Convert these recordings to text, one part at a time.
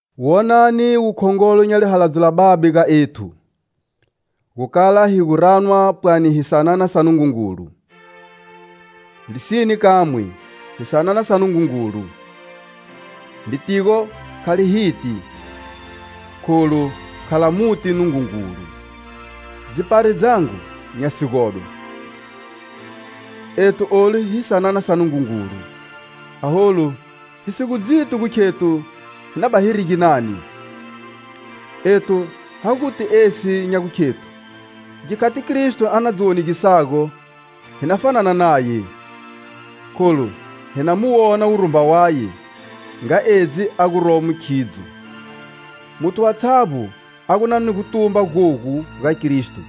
Wonani wukhongolo nya lihaladzo la Babe ga ethu, gu kala hi gu ranwa pwani hi sanana sa Nungungulu. Lisine kamwe, hi sanana sa Nungungulu. Litigo kha li hiti, kholu kha la muti Nungungulu. Dzipari dzangu nya sigodwa, ethu olu hi sanana sa Nungungulu, aholu, hi si gu dziti gu khethu hi na bani hiri ginani. Ethu ha guti esi nya gukhethu, gikhati Kristo a na dzi wonegisago, hi na fanana naye, kholu hi na mu wona wurumba waye, nga edzi a guromo khidzo. Muthu watshavbo a gu na ni gutumba gogu ga Kristo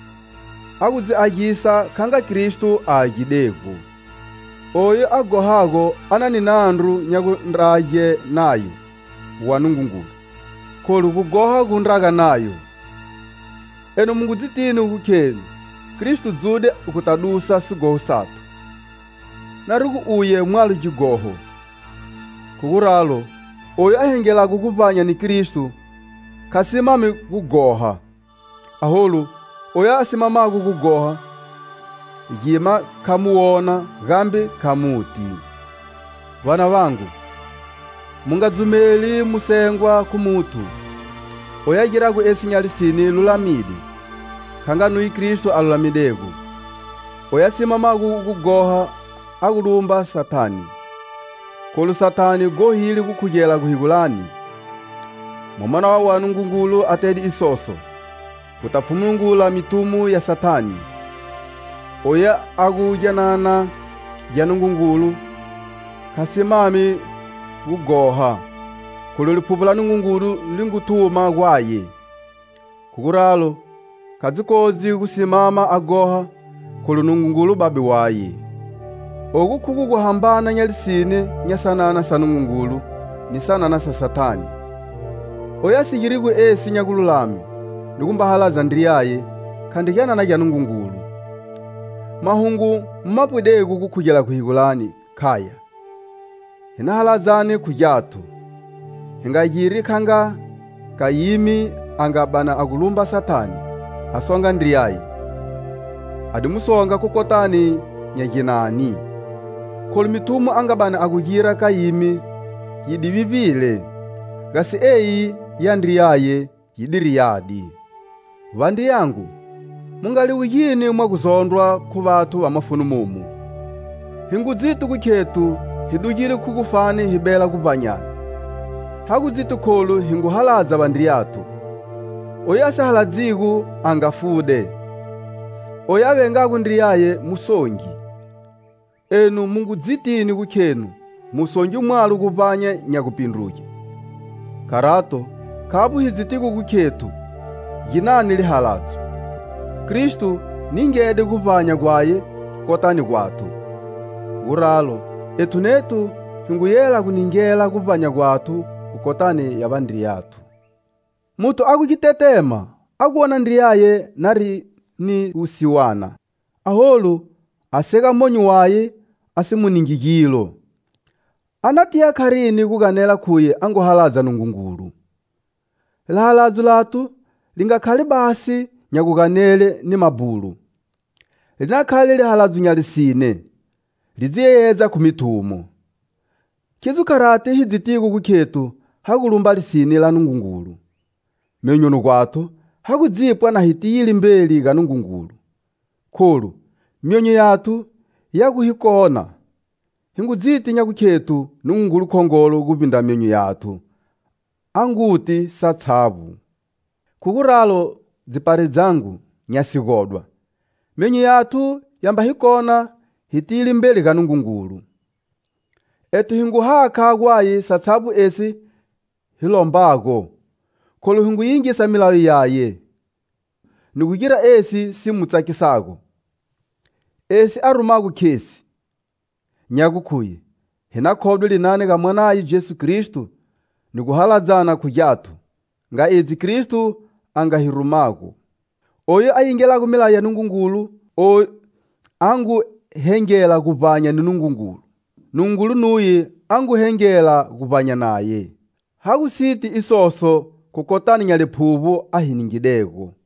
a gu dzi agisa kha nga Kristo a agidego. Oyu a ghohago a na ni nandru nya gundrage nayo wa Nungungulu, kholu gughoha gu ndraga nayo. Enu mu ngu dzitini gu khenu Kristo dzude guta dusa sighoho sathu, nari gu uye mwalo gighoho. Khu guralo, oyu a hengelago guvbanya ni Kristo kha simami gu ghoha. Aholu, oyu a simamago gughoha gima kha mu wona, gambe kha muti. Vanavangu, mu nga dzumeli mu sengwa khu muthu! Oyu a girago esi nya lisine lulamide, kha nga nuye Kristo a lulamidego. Oyu a simamago gu ghoha a gu lumba Sathane. Kholu Sathane ghohile gukhugela guhegulani. Mwamana wa Nungungulu atede isoso; guta pfhungumula mithumo ya Sathane. Oyu a gu gyanana gya Nungungulu kha simami gu ghoha, kholu Liphuvbo la Nungungulu li ngu thuma gwaye. Khu guralo, kha dzi kodzi gu simama a ghoha, kholu Nungungulu Babe waye. Ogu khugo guhambana nya lisine nya sanana sa Nungungulu ni sanana sa Sathane. Oyu a si girigo esi nya gululame, ni gumba haladza ndriyaye, khandri gyanana gya Nungungulu. Mahungu mu ma pwidego gukhugela guhegulani khaya: Hi na haladzane khu gyathu. Hi nga giri nga Kayimi a nga bani a gu lumba Sathane a songa ndriyaye. A di mu songa khu kotani nya ginani? Kholu mithumo a nga bani a gu gira Kayimi yi di vivbile, gasi eyi ya ndriyaye yidiri yadi. Vandriyangu, mu nga liwugi mwa gu zondrwa khu vathu va mafuni momu. Hi ngu dziti gu khethu hi dugile khu gufani hi bela guvbanyani. Ha gu dziti kholu hi ngu haladza vandriyathu. Oyu a si haladzigo a nga fude. Oyu a vengago ndriyaye musongi. Enu mu ngu dzitini gu khenu musongi mwalo guvbanya nya gupindruge. Kharato, khavbo hi dzitigo gu khethu ginani lihaladzo: Kristo ningede guvbanya gwaye kotani gwathu. Khu guralo, ethu nethu hi ngu yela gu ningela guvbanya gwathu khu kotani ya vandriyathu. Muthu a gu gitetema, a gu wona ndriyaye nari ni wusiwana, aholu a sega monyo waye, a si mu ningi gilo, a na tiya kharini gu ganela khuye a ngu haladza Nungungulu? Lihaladzo lathu li nga khali basi nya guganele ni mabhulo. Li na khale lihaladzo nya lisine, li dzi yeyedza khu mithumo. Khidzo kharati hi dzitigo gu khethu ha gu lumba lisine la Nungungulu, myonyoni gwathu ha gu dzipwa na hi tiyile mbeli ga Nungungulu. Kholu, myonyo yathu ya gu hi kona, hi ngu dziti nya gukhethu Nungungulu khongolo guvbindra myonyo yathu, a nguti satshavbo. Khu guralo, dzipari dzangu, nya sigodwa, myonyo yathu ya mba hi kona, hi tiyile mbeli ga Nungungulu. Ethu hi ngu hakha gwaye satshavbo esi hi lombago, kholu hi ngu yingisa milayo yaye, ni gu gira esi si mu tsakisago. Esi a rumago khesi; nya gukhuye hi na khodwe linani ga Mwanaye Jesu Kristo, ni gu haladzana khu gyathu nga edzi Kristo a nga hi rumago. Oyu a yingelago milayo ya Nungungulu a ngu hengela guvbanya ni Nungungulu, Nungungulu nuye a ngu hengela guvbanya naye. Ha gu siti isoso khu kotani nya Liphuvbo a hi ningidego.